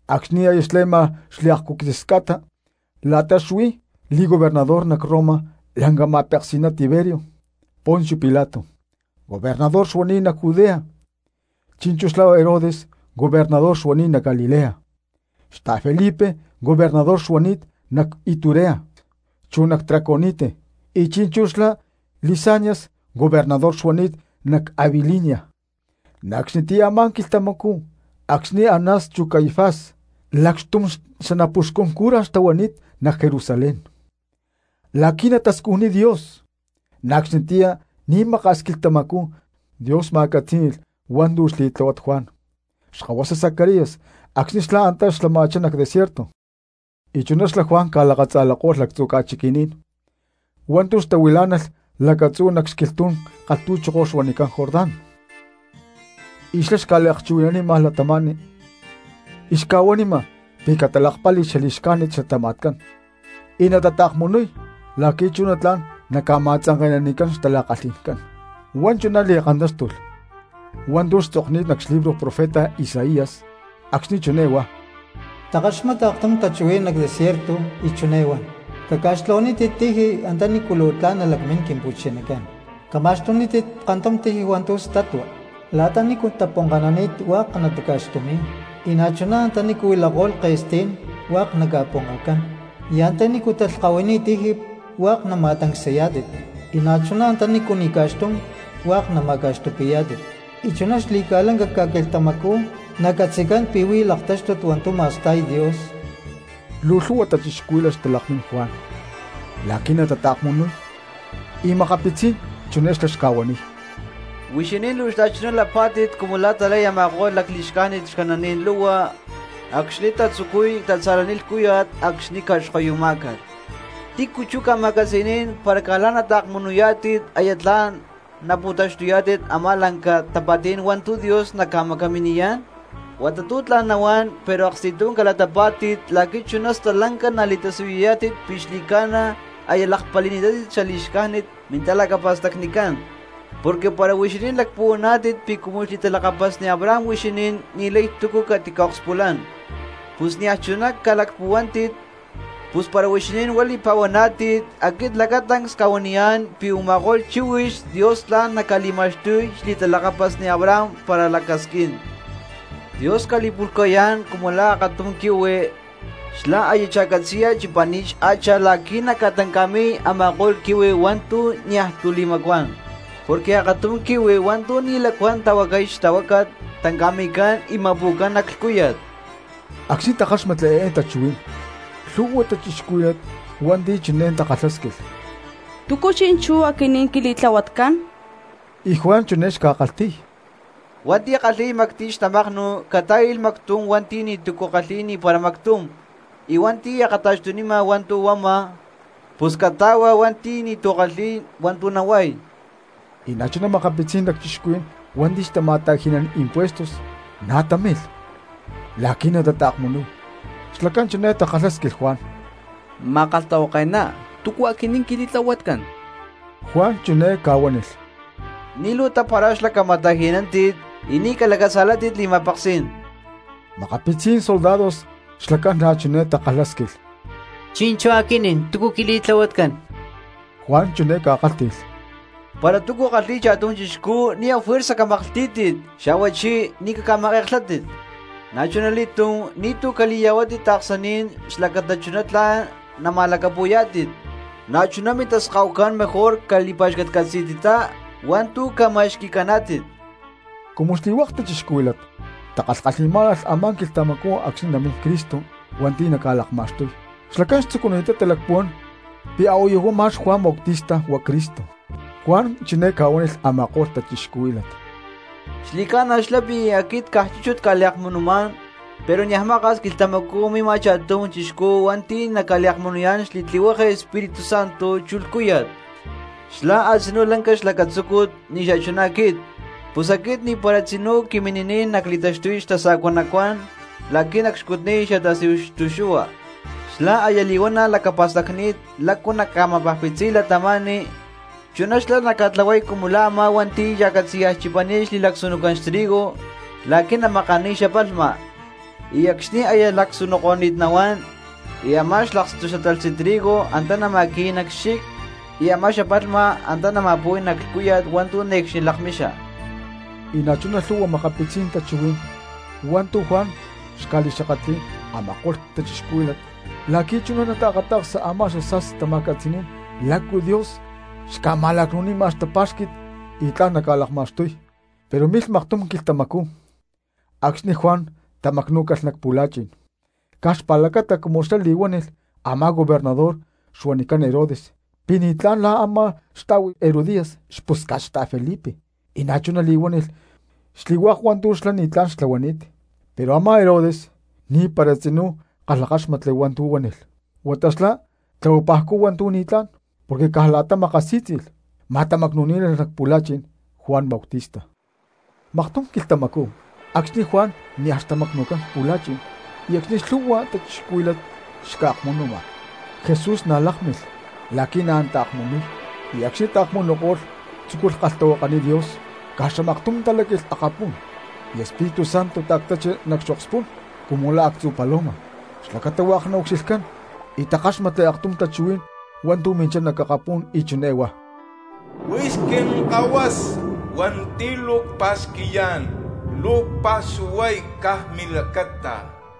Acxni̠ aya xle̠ma xliakcu̠quitzis ca̠ta la̠ta xuí li̠gobernador nac Roma lanca ma̠peksi̠ná Tiberio, Poncio Pilato gobernador xuani̠t nac Judea, chi̠nchú xlá Herodes gobernador xuani̠t nac Galilea, xta̠Felipe gobernador xuani̠t nac Iturea chu nac Traconite, y chi̠nchú xlá Lisanias gobernador xuani̠t nac Abilinia, na̠ acxnitiyá a̠má quilhtamacú acxni̠ Anás chu Caifás lacxtum xanapuxcun cura xtahuani̠t nac Jerusalén la̠qui̠ natascujniy Dios, na̠ acxnitiyá ni̠maka̠s quilhtamacú Dios ma̠catzí̠ni̠lh hua̠ntu̠ xli̠tláhuat Juan xkahuasa Zacarías acxni̠ xlá antá xlama̠chá nac desierto. Y chuná xlá Juan ca̠lakatza̠lako̠lh lactzu̠ ca̠chiquí̠n hua̠ntu̠ xtahuilá̠nalh lacatzú nac xquilhtú̠n kalhtu̠choko huanicán Jordán, y xlá xca̠liakchuhui̠nanima cristianos y xca̠huanima pi̠ natalakpali̠y xali̠xcájnit xlatama̠tcán y natata̠kmunuy la̠qui̠ chuná tla̠n naca̠ma̠tzanke̠nanicán xtala̠kalhi̠ncán. Huá chuná li̠kantáxtulh hua̠ntu̠ xtzokni̠t nac xlibro profeta Isaías acxni̠ chiné huá: Takaxmata aktum tachuhuí̠n nac desierto y chiné huan: “Caca̠xtlahuanítit tiji antanícu luu tla̠n nalacmín Quimpu̠chinacán; cama̠xtunítit kantum tiji hua̠ntu̠ statua. La̠ta nícu taponkanani̠t hua̠k nataca̠xtumi̠y, y na̠chuná antanícu huilako̠lh ke̠stí̠n hua̠k naca̠ponkacán, y antanícu talhkahuini̠t tiji hua̠k nama̠tancsayá̠tit, y na̠chuná antanícu ni̠ ca̠xtum hua̠k nama̠ca̠xtupi̠yá̠tit. Y chuná xli̠ca̠lanca ca̠quilhtamacú nacatzi̠cán pi̠ huí laktáxtut hua̠ntu̠ ma̠sta̠y Dios.” Luu lhu̠hua cristianos xtalakmín Juan la̠qui̠ natataakmunuy, y makapitzí̠n chiné xlá xca̠huaniy: —¡Huixinín luu xta̠chuná lapá̠tit cumu la̠ talay a̠ma̠ko̠lh lacli̠xcájnit xcananí̠n lu̠hua acxni̠ tatzucuy tatza̠laniy lhcúya̠t acxni̠ ca̠xkoyumá̠calh! ¿Tícu chú ca̠ma̠catzi̠ní̠n para caj la̠ nataakmunuyá̠tit aya tla̠n napu̠taxtuyá̠tit a̠má lanca tapa̠tí̠n hua̠ntu̠ Dios naca̠macaminiyá̠n? Huata tu̠ tla̠n nahuán pero aksti̠tum calatapá̠tit la̠qui̠ chuná stalanca nali̠tasiyuyá̠tit pi̠ xli̠ca̠na aya lakpali̠ni̠tátit xali̠xcájnit mintalacapa̠stacnicán. Porque para huixinín lacpuhuaná̠tit pi̠ cumu xli̠talakapasni Abraham huixinín ni̠lay túcu catica̠akspulán, pus niaj chuná calacpuhuántit; pus para huixinín huá li̠pa̠huaná̠tit, aquit lacatancs cca̠huaniyá̠n pi̠ u̠ma̠ko̠lh chíhuix Dios tla̠n naca̠li̠ma̠xtuy xli̠talakapasni Abraham para lacasquín. Dios ca̠li̠pu̠lhca̠yá̠n cumu la̠ akatum quihui, xlá aya cha̠catzi̠ya chipani̠t xhacha la̠qui̠ naca̠tanca̠mi̠y a̠ma̠ko̠lh quihui hua̠ntu̠ niaj tu̠ li̠macuán. Porque akatum quihui hua̠ntu̠ ni̠ lacuán tahuacay xtahuácat tanca̠mi̠cán y ma̠pu̠cán nac lhcúya̠t. Acxni̠ takáxmatli eé tachuhuí̠n lhu̠hua cristianos hua̠nti̠ chiné takalhásquilh: —¿Túcu chi̠nchú aquinín quili̠tlahuatcán? Y Juan chiné xca̠kalhti̠y: —Hua̠nti̠ kalhi̠y mactiy xtamaknu catá̠i̠lh mactum hua̠nti̠ ni̠tu̠cu kalhi̠y ni̠para mactum; y hua̠nti̠ akata̠xtunima hua̠ntu̠ huama pus cata̠hua hua̠nti̠ ni̠tu̠cu kalhi̠y hua̠ntu̠ nahuay. Y na̠chuná makapitzí̠n lacchixcuhuí̠n hua̠nti̠ xtama̠ta̠ji̠nán impuestos na̠ támilh la̠qui̠ na̠ natataakmunuy, xlacán chiné takalhásquilh Juan: —Ma̠kalhtahuake̠ná, ¿túcu aquinín quili̠tlahuatcán? Juan chiné ca̠huánilh: —Ni̠ luu tapara̠xlá cama̠ta̠ji̠nántit, y ni̠ calacatza̠látit li̠ma̠peksí̠n. Makapitzí̠n soldados xlacán na̠ chiné takalhásquilh: —Chi̠nchú aquinín, ¿túcu quili̠tlahuatcán? Juan chiné ca̠kálhti̠lh: —Para túcu kalhi̠y cha̠tum chixcú ni̠ afuerza camaklhtí̠tit, xa̠huachí ni̠ caca̠make̠klhátit; na̠chuna li̠túm ni̠tu̠ cali̠ya̠huátit taaksaní̠n xlacata chuná tla̠n nama̠lacapu̠yá̠tit, na̠chuná mintaskahucán mejor cali̠pa̠xcatcatzi̠tittá hua̠ntu̠ ca̠ma̠xqui̠caná̠tit. Cumu xli̠hua̠k cristianos xtakalhkalhi̠má̠nalh a̠má quilhtamacú acxni̠ namín Cristo hua̠nti̠ naca̠lakma̠xtuy, xlacán xtzucuni̠ttá talacpuhuán pi̠ a̠huayu ma̠x Juan Bautista huá Cristo. Juan chiné ca̠huánilh a̠ma̠ko̠lh cristianos: —Xli̠ca̠na xlá pi̠ aquit caj chúchut cca̠liakmunumá̠n, pero niaj maka̠s quilhtamacú mima cha̠tum chixcú hua̠nti̠ naca̠liakmunuyá̠n xli̠tlihueke Espíritu Santo chu lhcúya̠t. Xlá a̠tzinú lanca xlacatzúcut ni̠ xachuná aquit, pus aquit ni̠para tzinú quimini̠niy nacli̠taxtuy xtasa̠cua nacuán la̠qui̠ nacxcutniy xatasíhu xtu̠xu̠hua. Xlá aya li̠huana̠ lacapa̠stacni̠t lácu naca̠ma̠pajpitziy cristianos, chuná xlá naca̠tlahuay cumu la̠ a̠má hua̠nti̠ cha̠catzi̠ya chipani̠t xli̠lacsunucán xtrigo la̠qui̠ namakaniy xapalhma, y acxni̠ aya lacsunuko̠ni̠t nahuán y a̠má xlakstu xatalhtzi trigo antá nama̠qui̠y nac xchic, y a̠má xapalhma antá nama̠pu̠y nac lhcúya̠t hua̠ntu̠ ne̠cxni lakmixa. Y na̠chuná lhu̠hua makapitzí̠n tachuhuí̠n hua̠ntu̠ Juan xca̠li̠xakatli̠y a̠ma̠ko̠lh cristianos la̠qui̠ chuná nataakata̠ksa a̠má xasa̠sti tama̠catzi̠ní̠n lácu Dios xca̠ma̠lacnu̠nima xtapá̠xqui̠t y tla̠n naca̠lakma̠xtuy. Pero milh maktum quilhtamacú acxni̠ Juan tamacnú̠calh nac pu̠la̠chi̠n caj xpa̠lacata cumu xlá li̠huánilh a̠má gobernador xuanicán Herodes pi̠ ni̠tlá̠n la̠ a̠má xta̠hui Herodías xpusca̠t xta̠Felipe y na̠chuná li̠huánilh xli̠hua̠k hua̠ntu̠ xlá ni̠tlá̠n xtlahuani̠t. Pero a̠má Herodes ni̠para tzinú kalhakáxmatli hua̠ntu̠ huánilh, huata xlá tlahualhcú hua̠ntu̠ ni̠tlá̠n porque caj la̠ta makasí̠tzi̠lh ma̠tamacnu̠ní̠nalh nac pu̠la̠chi̠n Juan Bautista. Maktum quilhtamacú acxni̠ Juan nia̠ xtamacnu̠cán nac pu̠la̠chi̠n y acxni̠ lhu̠hua cristianos xca̠akmunuma, Jesús na̠ lákmilh la̠qui̠ na̠ nataakmunuy; y acxni̠ taakmunuko̠lh tzúculh kalhtahuakaniy Dios. Caj xamaktum taláqui̠lh akapú̠n y Espíritu Santo ta̠ctachi nac xokspú̠n cumu la̠ actzu̠ paloma xlacata hua̠k naucxilhcán y takáxmatli aktum tachuhuí̠n hua̠ntu̠ minchá nac akapú̠n y chiné huá: —Huix Quinkahuasa hua̠nti̠ luu cpa̠xqui̠yá̠n, luu cpa̠xuhuay caj milacata.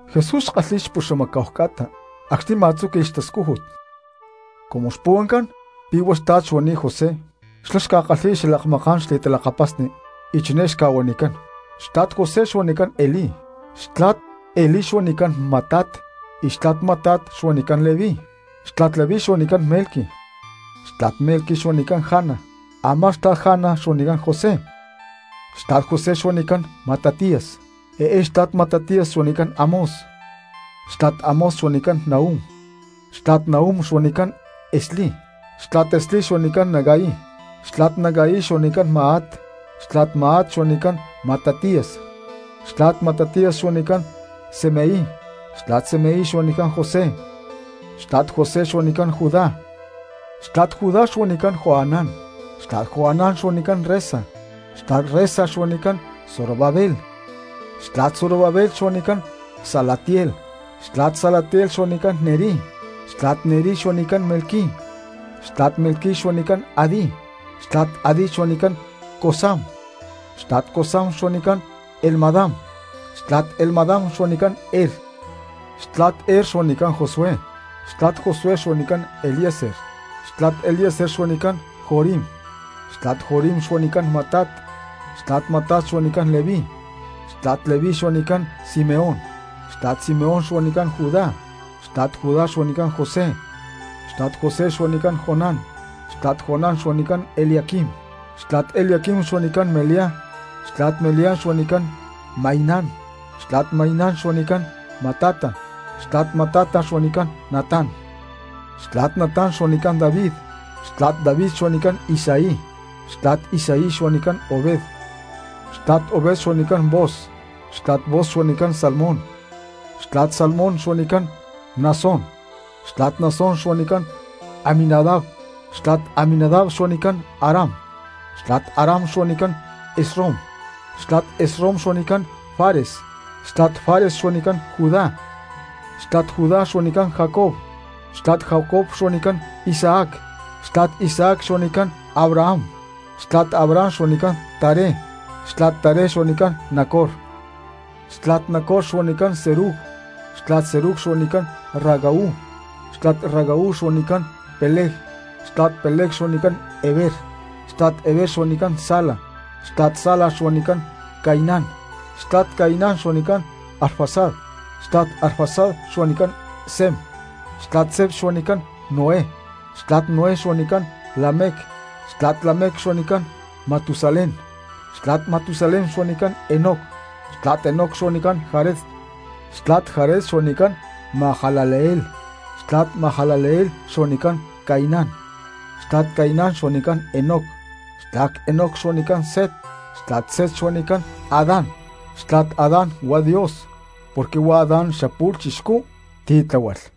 Jesús xkalhi̠y puxamacá̠hu ca̠ta acxni̠ ma̠tzúqui̠lh xtascújut. Cumu xpuhuancán pi̠ huá xtla̠t xuani̠t José xlá xca̠kalhi̠y xalakmaká̠n xli̠talakapasni y chiné xca̠huanicán: Xtla̠t José xuanicán Elí, xtla̠t Elí xuanicán Matat, xtla̠t Matat xuanicán Leví, xtla̠t Leví xuanicán Melqui, xtla̠t Melqui xuanicán Jana, a̠má xtla̠t Jana xuanicán José, xtla̠t José xuanicán Matatías, eé xtla̠t Matatías xuanicán Amós, xtla̠t Amós xuanicán Nahum, xtla̠t Nahum xuanicán Esli, xtla̠t Esli xuanicán Nagai, xtla̠t Nagai xuanicán Maat, xtla̠t Maat xuanicán Matatías, xtla̠t Matatías xuanicán Semei, xtla̠t Semei xuanicán José, xtla̠t José xuanicán Judá, xtla̠t Judá xuanicán Joanán, xtla̠t Joanán xuanicán Resa, xtla̠t Resa xuanicán Zorobabel, xtla̠t Zorobabel xuanicán Salatiel, xtla̠t Salatiel xuanicán Neri, xtla̠t Neri xuanicán Melqui, xtla̠t Melqui xuanicán Adi, xtla̠t Adi xuanicán Cosam, xtla̠t Cosam xuanicán Elmadam, xtla̠t Elmadam xuanicán Er, xtla̠t Er xuanicán Josué, xtla̠t Josué xuanicán Eliezer, xtla̠t Eliezer xuanicán Jorim, xtla̠t Jorim xuanicán Matat, xtla̠t Matat xuanicán Leví, xtla̠t Leví xuanicán Simeón, xtla̠t Simeón xuanicán Judá, xtla̠t Judá xuanicán José, xtla̠t José xuanicán Jonán, xtla̠t Jonán xuanicán Eliaquim, xtla̠t Eliaquim xuanicán Melia, xtla̠t Melia xuanicán Mainán, xtla̠t Mainán xuanicán Matata, xtla̠t Matata xuanicán Natán, xtla̠t Natán xuanicán David, xtla̠t David xuanicán Isaí, xtla̠t Isaí xuanicán Obed, xtla̠t Obed xuanicán Booz, xtla̠t Booz xuanicán Salmón, xtla̠t Salmón xuanicán Naasón, xtla̠t Naasón xuanicán Aminadab, xtla̠t Aminadab xuanicán Aram, xtla̠t Aram xuanicán Esrom, xtla̠t Esrom xuanicán Fares, xtla̠t Fares xuanicán Judá, xtla̠t Judá xuanicán Jacob, xtla̠t Jacob xuanicán Isaac, xtla̠t Isaac xuanicán Abraham, xtla̠t Abraham xuanicán Taré, xtla̠t Taré xuanicán Nacor, xtla̠t Nacor xuanicán Serug, xtla̠t Serug xuanicán Ragau, xtla̠t Ragau xuanicán Peleg, xtla̠t Peleg xuanicán Heber, xtla̠t Heber xuanicán Sala, xtla̠t Sala xuanicán Cainán, xtla̠t Cainán xuanicán Arfaxad, xtla̠t Arfaxad xuanicán Sem, xtla̠t Sem xuanicán Noé, xtla̠t Noé xuanicán Lamec, xtla̠t Lamec xuanicán Matusalén, xtla̠t Matusalén xuanicán Enoc, xtla̠t Enoc xuanicán Jared, xtla̠t Jared xuanicán Mahalaleel, xtla̠t Mahalaleel xuanicán Cainán, xtla̠t Cainán xuanicán Enoc, xtla̠t Enoc xuanicán Set, xtla̠t Set xuanicán Adán, xtla̠t Adán huá Dios porque huá Adán xapu̠lh chixcú ti̠ tláhualh.